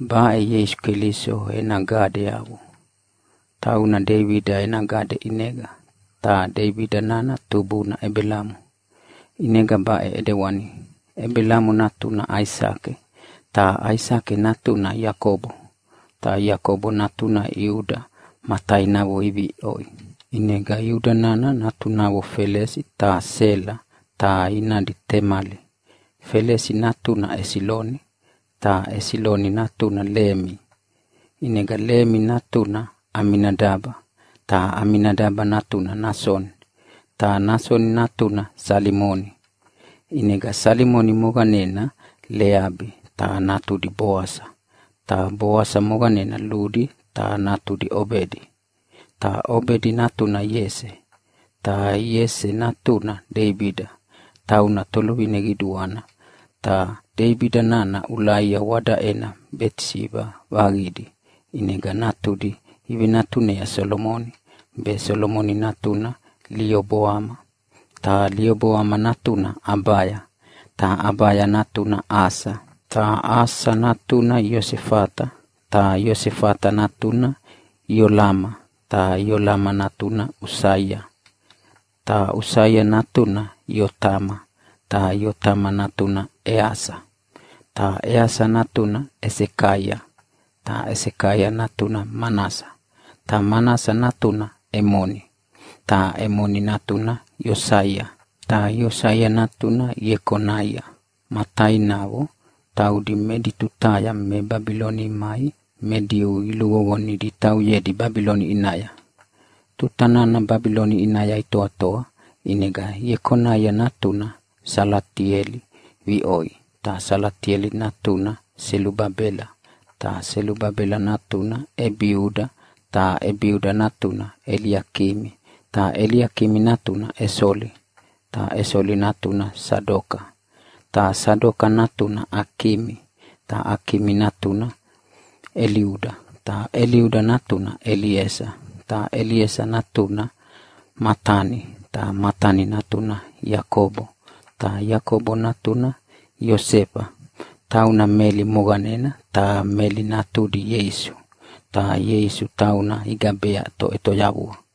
Baʼe Ieisu Keliso ena gadeyavo. Tauna Deibida ena gade ʼinega, ta Deibida nana tubuna Ebelamo. ʼInega baʼe ʼedewani: Ebelamo natuna Aisake, ta Aisake natuna Iakobo, ta Iakobo natuna Iuda ma tainavo iviʼoi. ʼInega Iuda nana natunavo Felesi ta Sela, ta inadi Temali. Felesi natuna Esiloni, ta Esiloni natuna Lemi. ʼInega Lemi natuna Aminadaba, ta Aminadaba natuna Nasoni, ta Nasoni natuna Salimoni. ʼInega Salimoni moqanena Leabi ta natudi Boasa, ta Boasa moqanena Ludi ta natudi Obedi, ta Obedi natuna Iese, ta Iese natuna Deibida, tauna toluvine qiduana. Ta Deibida nana Ulaia wadaʼena Betisiba vaqidi, ʼinega natudi ivenatunea Solomoni, be Solomoni natuna Lioboama, ta Lioboama natuna Abaya, ta Abaya natuna Asa, ta Asa natuna Iosefata, ta Iosefata natuna Iolama, ta Iolama natuna Usaia. Ta Usaia natuna Iotama, ta Iotama natuna Easa, ta Easa natuna Esekaia, ta Esekaia natuna Manasa, ta Manasa natuna Emoni, ta Emoni natuna Iosaia, ta Iosaia natuna Iekonaia ma tainavo, taudi edi tutaya me Babiloni imai me Diu iluqoqonidi itauyedi Babiloni ʼinaya. Tuta nana Babiloni ʼinaya itoatoa, ʼinega Iekonaia natuna Salatieli viʼoi, ta Salatieli natuna Selubabela, ta Selubabela natuna Ebiuda, ta Ebiuda natuna Eliakimi, ta Eliakimi natuna Esoli, ta Esoli natuna Sadoka, ta Sadoka natuna Akimi, ta Akimi natuna Eliuda, ta Eliuda natuna Eliesa, ta Eliesa natuna Matani, ta Matani natuna Iakobo, ta Iakobo natuna Iosefa, tauna Meli moqanena, ta Meli natudi Ieisu, ta Ieisu tauna igabea Toʼetoyavua.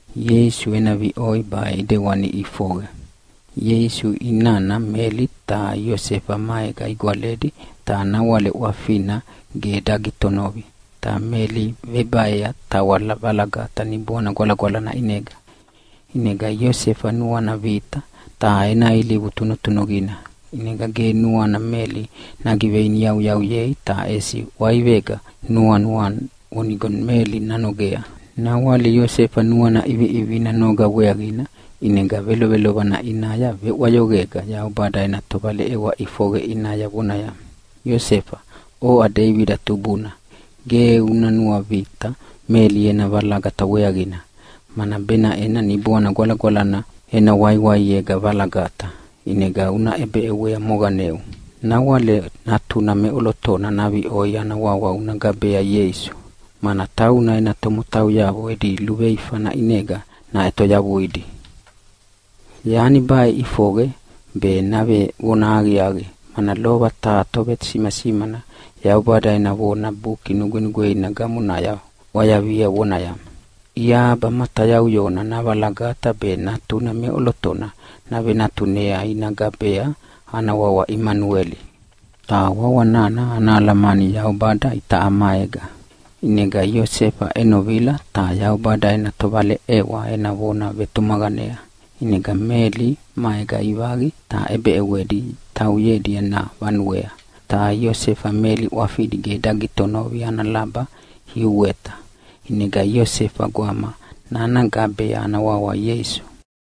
Ieisu ena viʼoi baʼe ʼidewani ʼifoqe: Ieisu inana Meli ta Iosefa maega igwaledi ta nawale ʼwafina ge dagitonovi, ta Meli vebaea tawa valagata Niboana Gwalagwalana ʼinega. ʼInega Iosefa nuana vita. Ta ena ilivu tunutunuqina, ʼinega ge nuana Meli nagiveiniyauyauyei ta ʼesi ʼwaivega nuanua vonigo Meli nanogea. Nawale Iosefa nuana ʼiviʼivina noga weaqina, ʼinega velovelovana ʼinaya veʼwayoqega Yaubada ena tovaleʼewa ʼifoqe ʼinaya vonaya, “Iosefa, oʼa Deibida tubuna, ge una nuavita Meli ena valagata weaqina, mana benaʼena Niboana Gwalagwalana ena waiwaiega valagata, ʼinega una ʼebeʼewea moqaneu. Nawale natuna meʼolotona naviʼoi ana wawa una gabea Ieisu, mana tauna ena tomotauyavo edi luveifana ʼinega naʼetoyavuidi.” Yani baʼe ʼifoqe be navevona aqiaqi, mana lova taha tovesimasimana Yaubada ena vona Buki Nugwenugweina gamonaya ʼwayavia vonaya, “Iahaba matayauyona navalagata be natuna meʼolotona navenatunea ina gabea ana wawa Imanueli.” Ta wawa nana ana alamani “Yaubada itaʼa maega”. ʼInega Iosefa ʼenovila ta Yaubada ena tovaleʼewa ena vona vetumaqanea, ʼinega Meli maega ivaqi ta ʼebeʼewedi tauyedi ena vanuea. Ta Iosefa Meli ʼwafidi ge dagitonovi ana laba iuweta, ʼinega Iosefa gwama nana gabea ana wawa Ieisu.